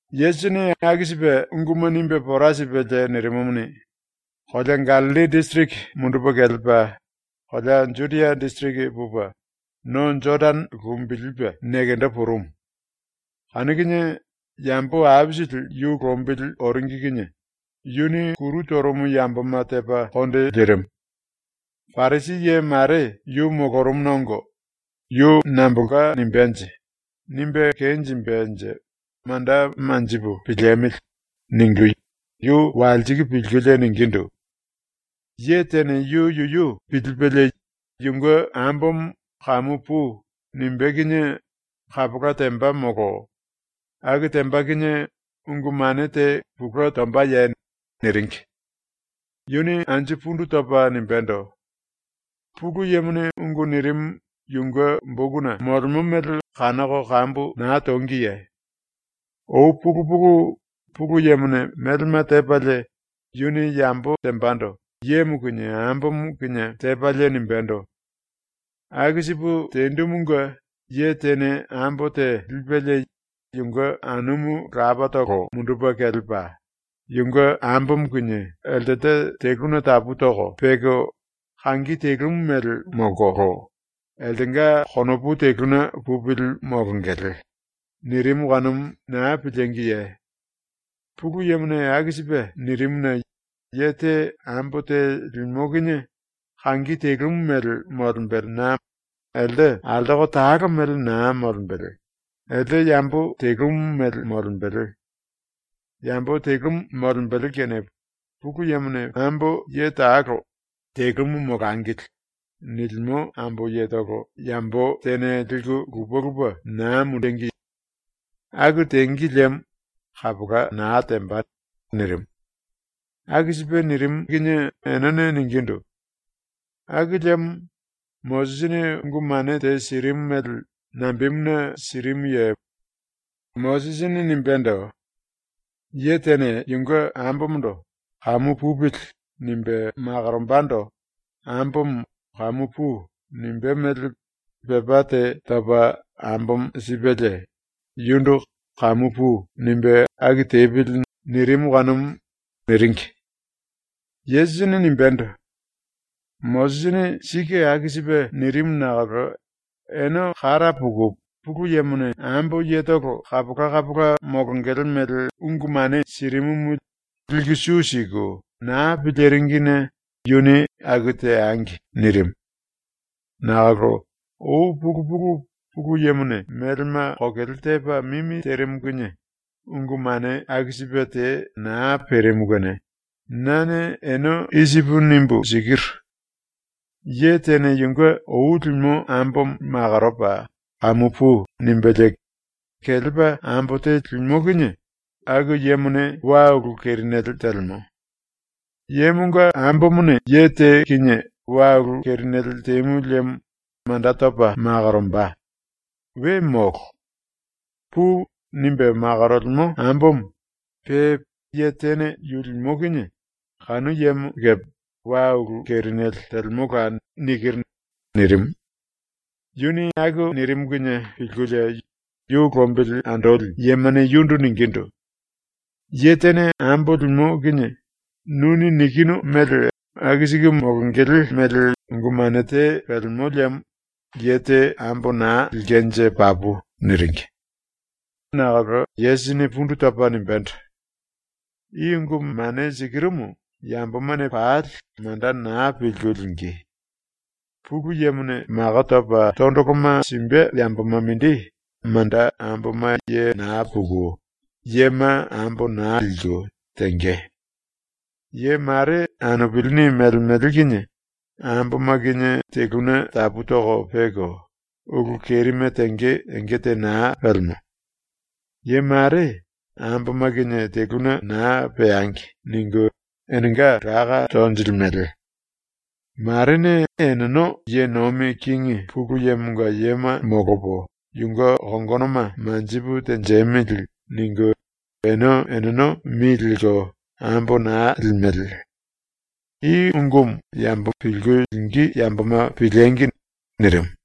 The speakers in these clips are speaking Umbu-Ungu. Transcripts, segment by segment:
Yesusini aku sipe unguma nimbe pora sipelie nirimumuni, kolea Gallilli disiriki mundupe kelepa kolea Judia disiriki pupe no Jodane lumbilipe nekendo purumu. Kanu kinie yambo aisili yu lombili oringi kinie yuni kuru torumu yamboma tepa konde lirimu. Parisi ye mare yu molorumuna ongo ‘Yu nambolka nimbenje? Nimbe kenjimbenje manda manjipu piliemili.’ ningu yu walsiku pilkulie ningindu: “Ye tene yu yuyu pilipelie yunge ambomo “Kamu pui.” nimbé kinie kapola temba molo aku temba kinie ungu mane te pulue tombaye?” niringi. Yuni anju pundu topa nimbendo: “Pulu Yemone ungu nirimu yunge bokuna molemo mele kanoko kambu na tongiye? Ou pulu pulu, Pulu Yemone melema tepalie, yuni yambo tembando yemo kinie ambomo kinie tepalie nimbendo: “Aku sipu tendumunge ye tene ambo te lipelie yunge anumu lapatolo mundupe kelepa yunge ambomo kinie eltelte teluna tapu toko peko kangi telumu mele ⸤molkolo eltenga konopu teluna pupili⸥ molongele.” nirimu kanumu na pilíngiye? Pulu Yemone aku sipe nirimuna ye te ambo te limo kinie kangi telumu mele molembelena elte altoko talo mele na molembele, elte yambo telumu mele molembele. Yambo telumu molembele kene Pulu Yemone ambo ye talo ‘Telumu molangili.’ nilimo ambo yetolo yambo tene liku lupe lupe na mundengi. Aku tengi liemo kapola na temba.” nirimu. Aku sipe nirimu kinie enene ningindu: “Aku liemo Mosisini ungu mane te sirimu mele nambemuna sirimuye? Mosisini nimbendo: “Ye tene yunge ambomondo ‘Kamu pupili.’ nimbe makorombando ambomo “Kamu pui.” nimbé mele pepá te topa ambomo sipelie yundu “Kamu pui.” nimbe aku tepili.” nirimu kanumu.” niringi. Yesusini nimbendo: “Mosisini sike aku sipe nirimu nakolo ene kara puku Pulu Yemone ambo yetolo kapola kapola molongele mele ungu mane sirimumu liku su siku na piliringine yuni “Aku teangi.” nirimu. Nakolo ou pulu pulu, ⸤Pulu Yemone melema kokele tepa mimi terimu kinie⸥, ungu mane aku sipe te na perimu kene nane ene i sipu nimbu sikiru: Ye tene yunge ou limo ambomo makoropa “Kamu pui.” nimbelie kelepa ambo te limo kinie aku yemone wa ulu kerinele telemo. Yemonga ambomone ye te kinie wa ulu kerinele temu liemo manda topa makoromba. We molo. (“Pui.” nimbe makorolemo ambomo pe ye tene yu limo kinie kanu yemo kepe wa ulu kerinele telemola.)” nikiru.” nirimu. ⸤Yuni aku nirimu kinie pilkulie⸥ yu lombili andoli yemane yundu ningindu: “Ye tene ambo limo kinie nuni nikinu mele aku siku molongele mele ungu mane te pelemo liemo ye te ambo na lilkenje papu.” niringi. Nakolo Yesusini pundu topa nimbendo: “I ungu ⸤mane sikirumu⸥ yambomane pali manda na pilku lingí. ⸤Pulu Yemone⸥ mako topa tondoloma simbe yamboma mindi manda ⸤amboma ye na puku yema ambo na liku⸥ tenge. Ye mare anupilini melemele kinie amboma kinie teluna tapu toko peko ulu kerime tenge enge te na pelemo. Ye mare ‘Amboma kinie teluna na peangi.’ ningu enenga láka tonjilimele. Marene eneno ‘Ye nomi kingi Pulu Yemonga yema molopo yunge kongonoma manjipu tenjemili.’ ningu ene eneno mi lelko ambo na limele. I ungumu yambo pilku lingí yamboma piliengi!” nirimu.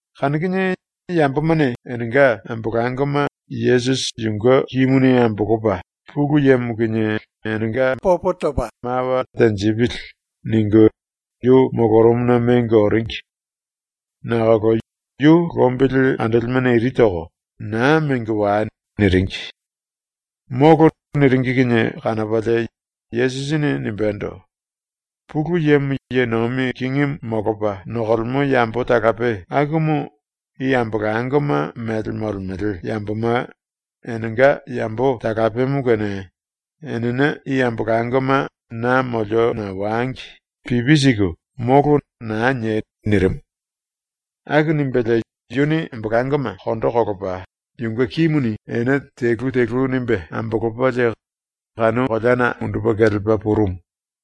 Kanu kinie yambomane enenga ambolangoma ‘Yesusi yunge kimuni ambolopa Pulu Yemo kinie enenga mawa tenjipili.’ ningu yu molorumuna mengo oringi. Nakolo yu lombili andolimene iri toko ⸤“Naa mengo wai.”⸥ niringi. ⸤“Molo.” niringi kinie⸥ kanopalie Yesusini nimbendo: “Pulu Yemo ye nomi kingimu molopa nokolemo yambo talape akumu i ambolangoma mele molemele yamboma enenga yambo talapemo kene enene i ambolangoma na moliona wangi pipi siku “Molo.” na niei.” nirimu. Aku nimbelie yuni ambolangoma ⸤kondo kolopa⸥ yunge kimuni ene telu telu nimbe ambolopalie kanu koleana mundupe kelepa purumu.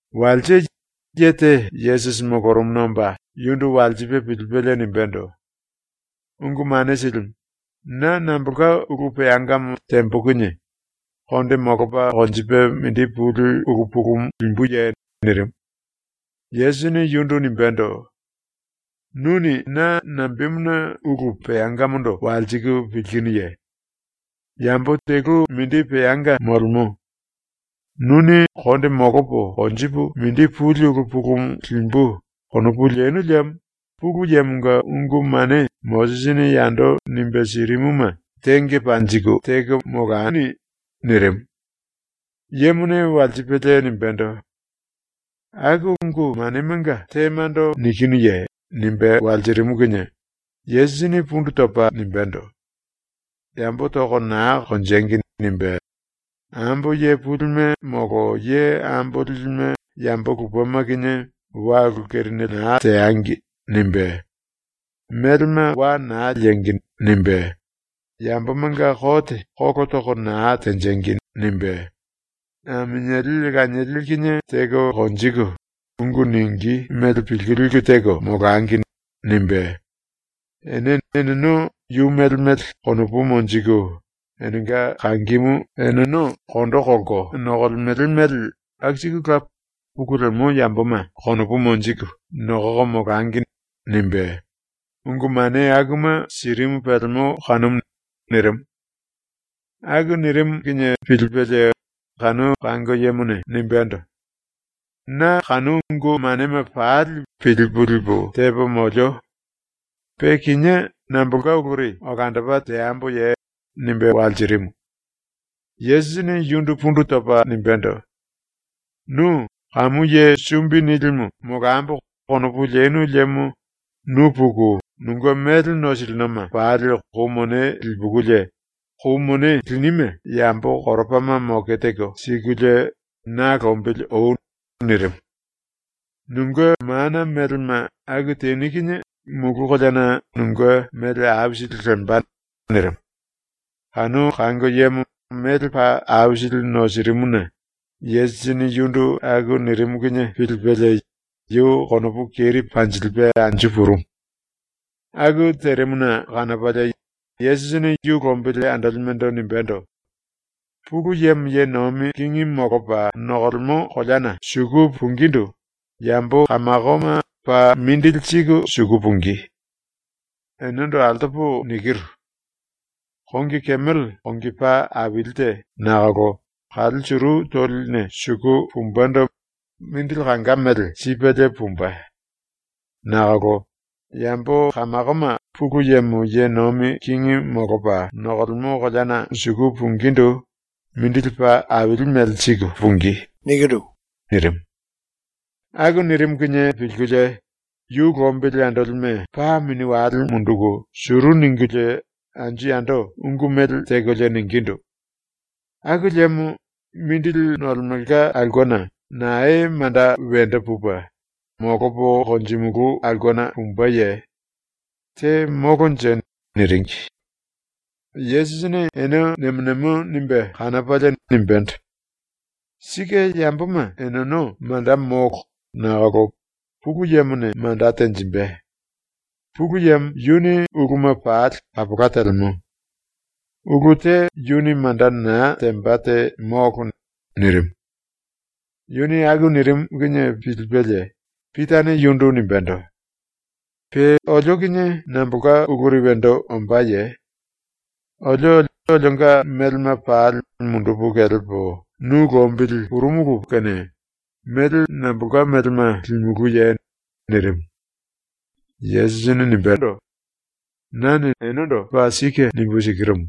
Walse ye te Yesusi molorumuna omba yundu walsipe pilipelie nimbendo: “Ungu Mane Silimu, na nambolka ulu peangamo tembo kinie konde molopa konjipe mindi puli ulu pulumu limbuye?” nirimu. Yesusini yundu nimbendo: “Nuni na nambemuna ulu peangamondo walsiku pilkinuye? Yambo telu mindi peanga molemo. Nuni ‘konde molopo konjipu mindi puli ulu pulumu limbu.’ konopu lenu liemo ⸤Pulu Yemonga⸥ ungu mane ⸤Mosisini yando nimbe sirimuma⸥ tenge panjiku teko molani.” nirimu. Yemone walsipelie nimbendo: “Aku ungu manemanga temando nikinuye?” nimbe walsirimu kinie Yesusini pundu topa nimbendo: “ “Yambo toko na konjengi.” nimbe, “Ambo ye pulime molo ye ambo lilime yambo lupema kinie wa ulu kerinele na teangi.” nimbe, “Melema wa na liengi.” nimbe, “Yambomanga kote kolo toko na tenjengi.” nimbe, “Aminieli lanieli kinie teko konjiku, ungu ningí mele pilku liku teko molangi.” nimbe, “Ene eneno yu mele mele konopu monjiku enenga kangimu eneno kondo kolko nokolemele mele aku sikula pulu lemo yamboma konopu monjiku nokoko molangi.” nimbe, ungu mane akuma sirimu pelemo kanumu.” nirimu. Aku nirimu kinie pilipelie kanu kango yemone nimbendo: “Na kanu ungu manema pali pilipu lipu tepo molio. Pe kinié nambolka uluri olandopa teamboye?” nimbe walsirimu. Yesusini yundu pundu topa nimbendo: “Nu ‘kamu ye sumbi nilimu molambo.’ konopu lenu liemo nu puku nunge mele nosilinoma pali kou mone lipukulie, kou mone linime yambo koropama moke teko sikulie na lombili oi.” nirimu. “Nunge ⸤mana⸥ melema aku teni kinie mulu koleana nunge mele aisili lemba.” nirimu. Kanu kango yemo mele paa aisili nosirimuna Yesusini yundu aku nirimu kinie pilipelie yu konopu keri panjilipe anju purumu. ⸤Aku terimuna kanopalie⸥ Yesusini yu lombili andolimendo nimbendo: “Pulu Yemo ye nomi kingi molopa nokolemo koleana suku pungindu yambo kamakoma paa mindili siku suku pungí. Enendo altopo nikiru: Kongi kemele ⸤kongi paa aili te nakolo⸥ kale suru toline suku pumbendo mindili kanga mele sipelie pumbe. Nakolo yambo kamakoma Pulu Yemo ye nomi kingi molopa nokolemo koleana suku pungindu mindili paa aili mele siku pungí.” nirimu. Aku nirimu kinie pilkulie yu lombili andolime paa mini wale munduku suru ningulie anju yando ungu mele tekolie ningindu: “Aku liemo mindili nolemelka aulkena nae manda wendo pupe, molopo konjimulu aulkena pumbeye? Te molonje.” niringi. Yesusini ene nemo nemo nimbe kanopalie nimbendo: “Sike yamboma eneno manda molo nakolo Pulu Yemone manda tenjimbe. Pulu Yemo yuni uluma pali kapola telemo. Ulu te yuni manda na temba te molo.” nirimu. Yuni aku nirimu kinie pilipelie Pitane yundu nimbendo: “⸤Pe olio kinie nambolka uluri wendo ombáye?⸥ Olio olionga melema pali mundupu kelepo nu lombili purumulu pulimolo kene mele nambolka melema limulúye?” nirimu. Yesusini nimbendo: “Nane enendo paa sike nimbu sikirumu: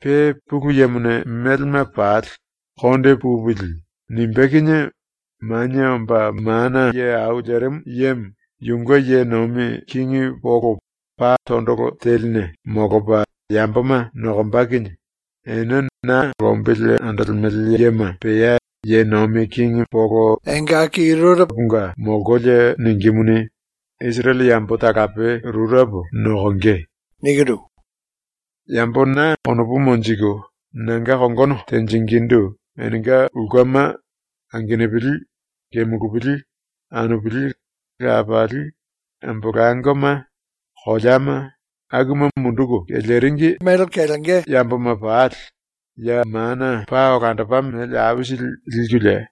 Pe ⸤Pulu Yemone⸥ melema pali ‘konde pupili.’ nimbé kinie Manie Omba Mana Ye Au Lerimu Yemo yunge ye nomi kingi polo pa tondolo teline molopa yamboma nokomba kinie, ene na lombili andolemele yema pea ye nomi kingi polo rureponga molkolie ningímuni, Isirele yambo talape rurepo nokonge. Yambo na konopu monjiku nanga kongono tenjingindu enenga ulkema, angenupili, kemulupili, anupili, lapali, ambolangoma, koleama, akuma munduku keleringi yamboma pali, ya mana paa olandopa mele aisili likulie,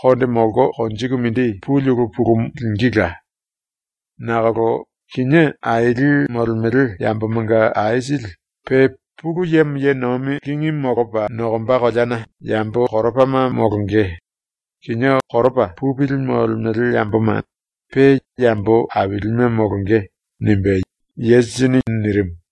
konde molko konjiku mindi puli ulu pulumu lingíla. Nakolo kinié aili molemele yambomanga aisili pe ⸤Pulu Yemo ye nomi kingi molopa nokomba koleana⸥ yambo koropama molonge; kinié koropa pupili molemele yamboma pe yambo ailime molonge.” ⸤nimbe Yesusini nirimu.⸥